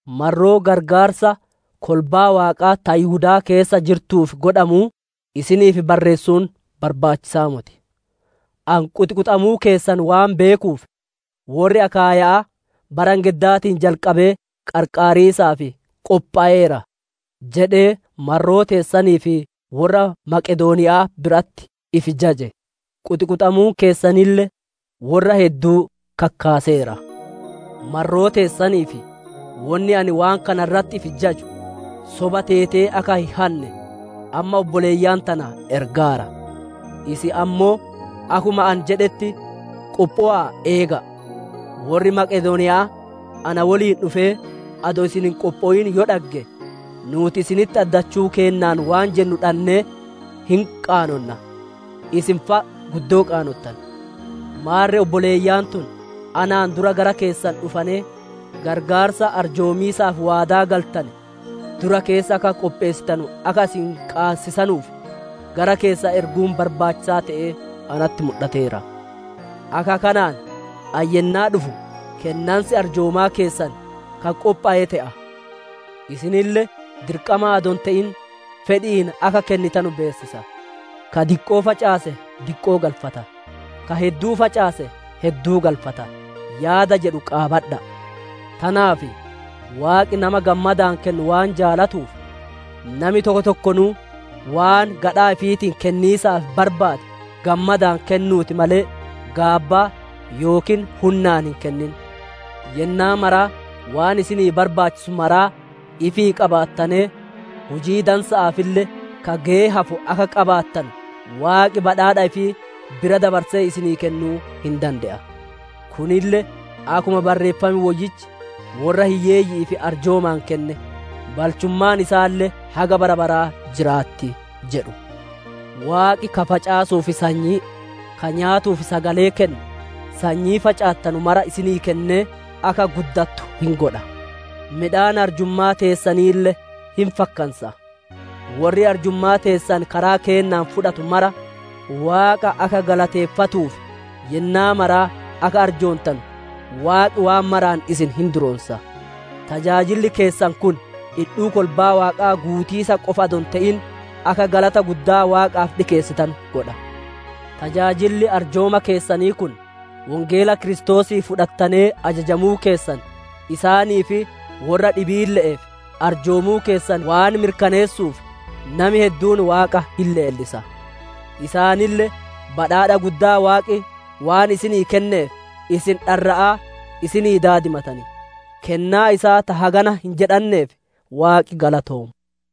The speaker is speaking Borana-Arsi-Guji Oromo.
Marroo qarqaarsa kolbaa Waaqaa ta Yihudaa keessa jirtuuf godhamuu, isiniif barreessuun barbaachisa'aa moti. Ani quxiquxamuu keessan waan beekuuf, «Worri Akaayya'aa bara engeddaatiin jalqabee qarqaariisaaf qophoweera» jedhee marroo teessaniif worra Meqedooniya'aa biratti ifi jaje; quxiquxamuun keessanille worra hedduu kakkaaseera. Marroo teessaniif wonni ani waan kana irratti ifi jaju, soba teetee akka hin hanne amma obboleeyyan tana ergaara; isin ammoo akkuma ani jedhetti qophowa'aa eega'a. Worri Maqedooniya'aa na woliin dhufee, adoo isin hin qophowin yoo dhagge, nuuti isinitti addachuu keennaan waan jennu dhannee hin qaanonna; isin fa'a guddoo qaanottan. Maarre obboleeyyan tun anaan dura gara keessan dhufanee, qarqaarsa arjoomiisaaf waadaa galtane dura keessa akka qopheessitanu akka isin qaabachiisanuuf, gara keessan erguun barbaachisaa te'ee natti mudhateera. Akka kanaan ani yennaa dhufu kennansi arjoomaa keessan ka qophowe te'a; isinille dirqamaan adoo hin te'in fedhi'iin akka kennitanu beessisa. «Ka diqqoo facaase diqqoo galfata; ka hedduu facaase hedduu galfata» yaada jedhu qaabadha'a. Tanaaf Waaqi nama gammadaan kennu waan jaalatuuf, nami tokko tokkonuu waan gadhaa ifiitiin kenniisaaf barbaade gammadaan kennuuti malee, gaabbaa yookiin hunnaan hin kennin. Yennaa mara waan isinii barbaachisu maraa ifii qabaattanee, hujii dansa'aafille ka geyee hafu akka qaabattanu Waaqi badhaadha ifii bira dabarsee isinii kennuu hin dande'a. Kunille akkuma Barreeffam Woyyichi, «Worra hiyyeeyyi'iif arjoomaan kenne; balchummaan isaalle haga bara baraa jiraatti» jedhu. Waaqi ka facaasuuf sanyii, ka nyaatuuf sagalee kennu, sanyii facaattanu mara isinii kennee akka guddattu hin godha; midhaan arjummaa teessaniille hin fakkansa. Worri arjummaa teessan karaa keennaan fudhatu mara, Waaqa akka galateeffatuuf yennaa maraa akka arjoontanu, Waaqi waan maraan isin hin duroonsa. Tajaajilli keessan kun dhidhuu kolbaa Waaqaa guutiisa qofa adoo hin te'in, akka galata guddaa Waaqaaf dhikeessanu godha. Tajaajilli arjooma keessanii kun, Wongeela Kiristoosii fudhattanee ajajamuu keessan, isaanii fi worra dhibiille'eef arjoomuu keessan waan mirkaneessuuf, nami hedduun Waaqa hin leellisa. Isaanille badhaadha guddaa Waaqi waan isinii kenneef, isin dharra'aa isinii daadimatan. Kennaa isaa ta hagana hin jedhanneef, Waaqi galatoomu.